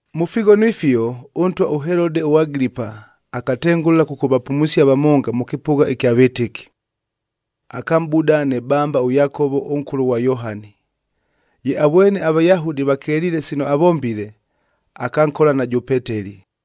Mʉ fighono ifio, ʉntwa ʉHelode ʉAgilipaa akatengʉla kʉkʉvapumusia vamonga mʉ kɨpʉgha ɨkya vɨtɨki. Akamʼbuda nɨ bamba ʉYakovob ʉnkʉlʉ ghwa Yohani. Ye avwene aVayahudi vakeliile sino avombile, akankola najʉ Peteli.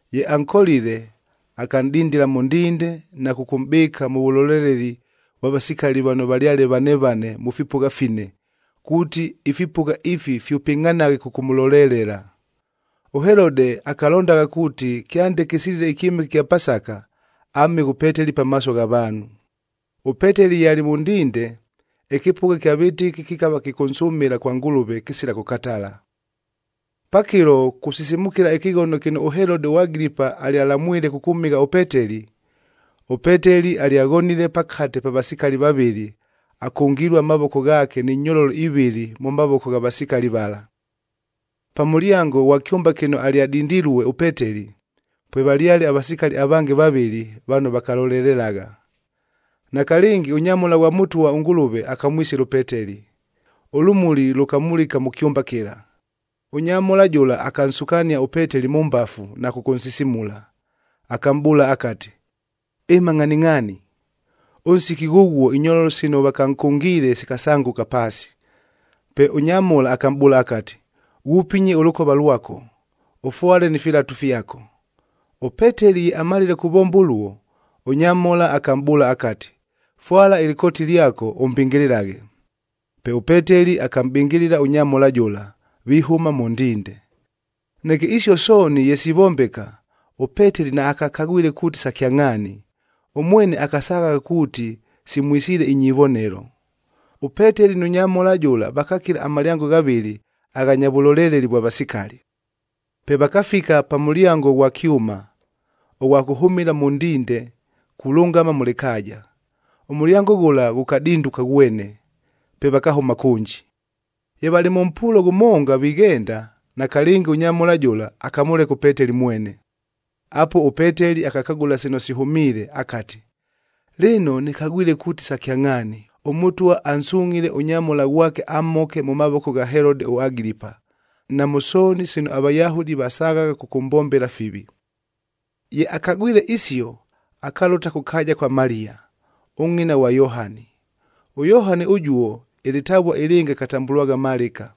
Ye ankolile, akanʼdindila mʉ ndinde na kʉkʉmʼbɨɨka mʉ vʉloleleli vwa vasikali vano valyale vane vane mʉ fipʉgha fine, kuuti ifipʉgha ifi fyʉpɨngʼhanaghe kʉkʉmʉlolelela. ɄHelode akalondagha kuuti kyande kɨsilile ɨkyɨmɨke ɨkya Pasaka, amhɨghe ʉPeteli pamaaso gha vaanhu. ɄPeteli ye alɨ mʉ ndinde, ɨkɨpʉgha kya vɨtɨki kɨkava kɨkʉnsʉmɨla kwa Ngʉlʉve kɨsila kʉkatala. Pakɨlo kusisimukila ɨkɨghono kɨno ʉHelode ʉAgilipa alyalamwile kʉkʉmhɨgha ʉPeteli, ʉPeteli alyaghonile pakate pa vasikali vavɨlɨ akʉngilue amavoko ghaake ni nyololo ivɨlɨ mʉ mavoko gha vasikali vala. Pa mʉlyango ghwa kyʉmba kɨno alyadindilue ʉPeteli, pwevalyale avasikali avange vavɨlɨ vano vakalolelelagha. Nakalɨngi, ʉnyamhola ghwa Mʉtwa ʉNgʉlʉve akamwisila ʉPeteli, ʉlʉmuli lʉkamulika mʉ kyʉmba kɨla. Ʉnyamhola jʉla akansukania ʉPeteli mʉ mbafu na kʉkʉnsisimula, akamʼbʉʉla akati, “Ɨma ngʼhaningʼhaani!” Ʉnsiki ghʉghuo inyololo sino vakankʉngiile sikasangʉka paasi. Pe ʉnyamhola akamʼbʉʉla akati, “Ghupinye ʉlʉkova lwako, ʉfwale ni filatu fyako.” ɄPeteli ye amalile kuvomba ʉluo, ʉnyamhola akamʼbʉʉla akati, “Fwala ɨlɨkooti lyako, ʉmbɨngɨlɨlaghe.” Pe ʉPeteli akamʼbɨngɨlɨla ʉnyamhola jʉla, vihʉma mʉ ndinde. Neke isio sooni ye sivombeka, ʉPeteli naakakagwile kuuti sa kyangʼhaani, ʉmwene akasaghagha kuuti simwisiile inyivonelo. ɄPeteli nʉ nyamhola jʉla vakakila amalyango ghavɨlɨ aghanya vʉloleleli vwa vasikali. Pe vakafika pa mʉlyango ʉghwa kyʉma, ʉghwa kʉhʉmɨla mʉ ndinde kulʉngama mʉ lɨkaaja. Ʉmʉlyango ghʉla ghʉkadinduka ghwene, pe vakahʉma kʉnji. Ye valɨ mʉ mpuulo ghʉmonga vighenda, nakalɨngi ʉnyamhola jʉla akamʉleka ʉPeteli mwene. Apuo ʉPeteli akakagʉla sino sihʉmiile akati, “Lɨno, nɨkagwile kuuti sa kyangʼhaani, ʉMʉtwa ansungʼhile ʉnyamhola ghwake amhoke mʉ mavoko gha Helode ʉAgilipa, na mʉ sooni sino aVayahudi vasaghagha kʉkʉmbombela fivi.” Ye akagwile isio, akalʉta kʉ kaaja kwa Maliya, ʉngʼina ghwa Yohani. ɄYohani ʉjuo ɨlɨtavua ɨlɨngɨ akatambʉlwagha Malɨka.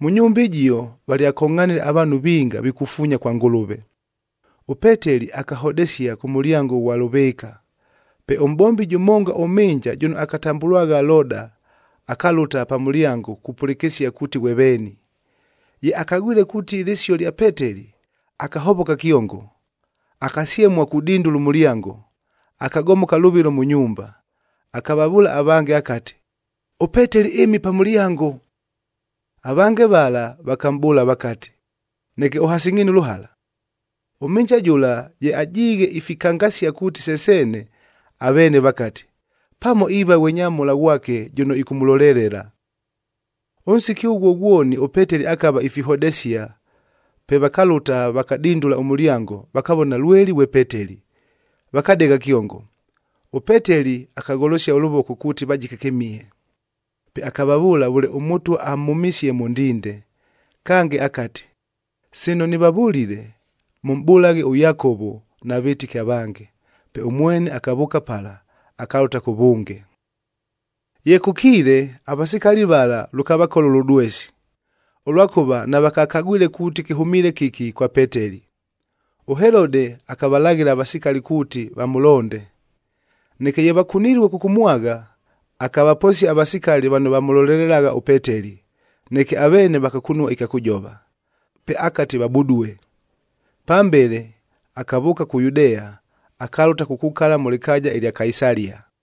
Mʉ nyumba ɨjio valyakongʼhanile avaanhu vinga vikufuunya kwa Ngʉlʉve. ɄPeteli akahodesia kʉ mʉlyango ʉghwa lʉvɨɨka. Pe ʉmʼbombi jʉmonga ʉmhɨnja jʉno akatambʉlwagha Loda, akalʉta pa mʉlyango kupʉlɨkɨsia kuuti ghwe veeni. Ye akagwile kuuti lɨsio lya Peteli, akahovoka kyongo, akasyemua kudindula ʉmʉlyango. Akagomoka lʉvɨlo mʉ nyumba, akavavʉʉla avange akati, “ɄPeteli ɨmile pa mʉlyango!” Avange vala vakamʼbʉʉla vakati, “Neke ʉhasingʼhiine ʉlʉhala!” Ʉmhɨnja jʉla ye ajiighe ifikangasia kuuti se seene, aveene vakati, “Pamo iiva ghwe nyamhola ghwake jʉno ɨkʉmʉlolelela.” Ʉnsiki ʉghuo ghwoni ʉPeteli akava ifihodesia, pe vakalʉta, vakadindula ʉmʉlyango, vakavona lweli ghwe Peteli, vakadegha kyongo. ɄPeteli akagholosia ʉlʉvoko kuuti vajike kɨmihe. Pe akavavʉʉla vʉle ʉMʉtwa amhʉmisie mʉ ndinde. Kange akati, “Sino nɨvavʉlile, mʉmʼbʉlaghe ʉYakovo na vɨtɨki avange.” Pe ʉmwene akavʉʉka pala, akalʉta kʉvʉnge. Ye kʉkiile, avasikali vala lʉkavakola ʉlʉdwesi, ʉlwakʉva navakakagwile kuuti kɨhʉmiile kɨki kwa Peteli. ɄHelode akavalaghɨla avasikali kuuti vamʉlonde. Neke ye vakunilue kʉkʉmwagha, akavaposia avasikali vano vamʉlolelelagha ʉPeteli, neke aveene vakakunua ɨkya kʉjova. Pe akati vabudue. Pambele akavʉʉka kʉ Yudea, akalʉta kukukala mʉ lɨkaaja ɨlya Kaisalia.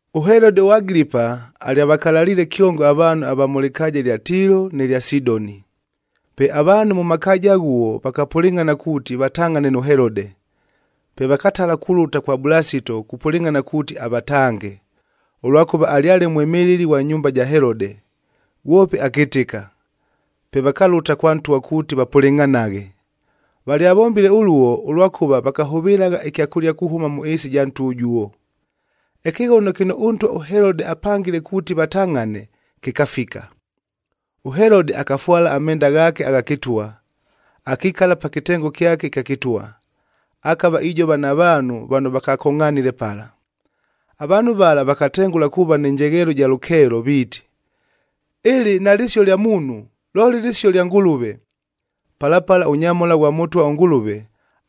ɄHelode ʉAgilipa alyavakalaliile kyongo avaanhu ava mʉ lɨkaaja ɨlya Tiilo nɨ lya Sidoni. Pe avaanhu mʉ makaaja aghuo vakapʉlɨngʼhana kuuti vatangʼhane nʉ Helode. Pe vakatala kulʉta kwa Bulasito kupʉlɨngʼhana kuuti avatange, ʉlwakʉva alyale mwɨmɨlɨli ghwa nyumba ja Helode, ghwope akɨtɨka. Pe vakalʉta kwa ntwa kuuti vapʉlɨngʼhanaghe. Valyavombile ʉluo ʉlwakʉva vakahʉvɨlagha ɨkyakʉlia kuhʉma mʉ ɨɨsi ɨja ntwa ʉjuo. Ɨkɨghono kɨno ʉntwa ʉHelode akapangile kuuti vatangʼhane, kɨkafika. ɄHelode akafwala amenda ghaake agha kɨtwa, akikala pa kɨtengo kyake ɨkya kɨtwa, akava ijova na vaanhu vano vakakongʼhanile pala. Avaanhu vala vakatengʉla kuuva nɨ njegheelo ɨja lʉkeelo viiti, “Ɨlɨ nalɨsio lya muunhu, looli lɨsio lya ngʉlʉve.” Pala pala ʉnyamhola ghwa Mʉtwa ʉNgʉlʉve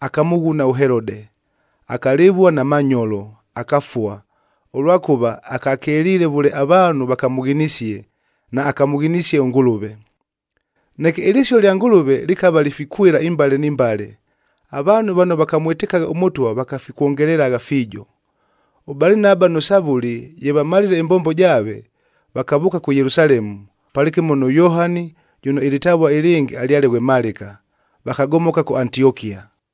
akamʉghuna ʉHelode, akalɨvua na manyolo, akafua, ʉlwakʉva akakeliile vʉle avaanhu vakamʉghinisie, naakamʉghinisie ʉNgʉlʉve. Neke ɨlɨsio lya Ngʉlʉve lɨkava lifikwɨla imbale ni mbale, avaanhu vano vakamwɨtɨkagha ʉMʉtwa vakafikwongelelagha fiijo. ɄBalinaba nʉ Savʉli ye vamalile ɨmbombo jaave, vakavʉʉka kʉ Yelusalemu, palɨkɨmo nʉ Yohani jʉno ɨlɨtavua ɨlɨngɨ alyale ghwe Malɨka, vakagomoka kʉ Antiokia.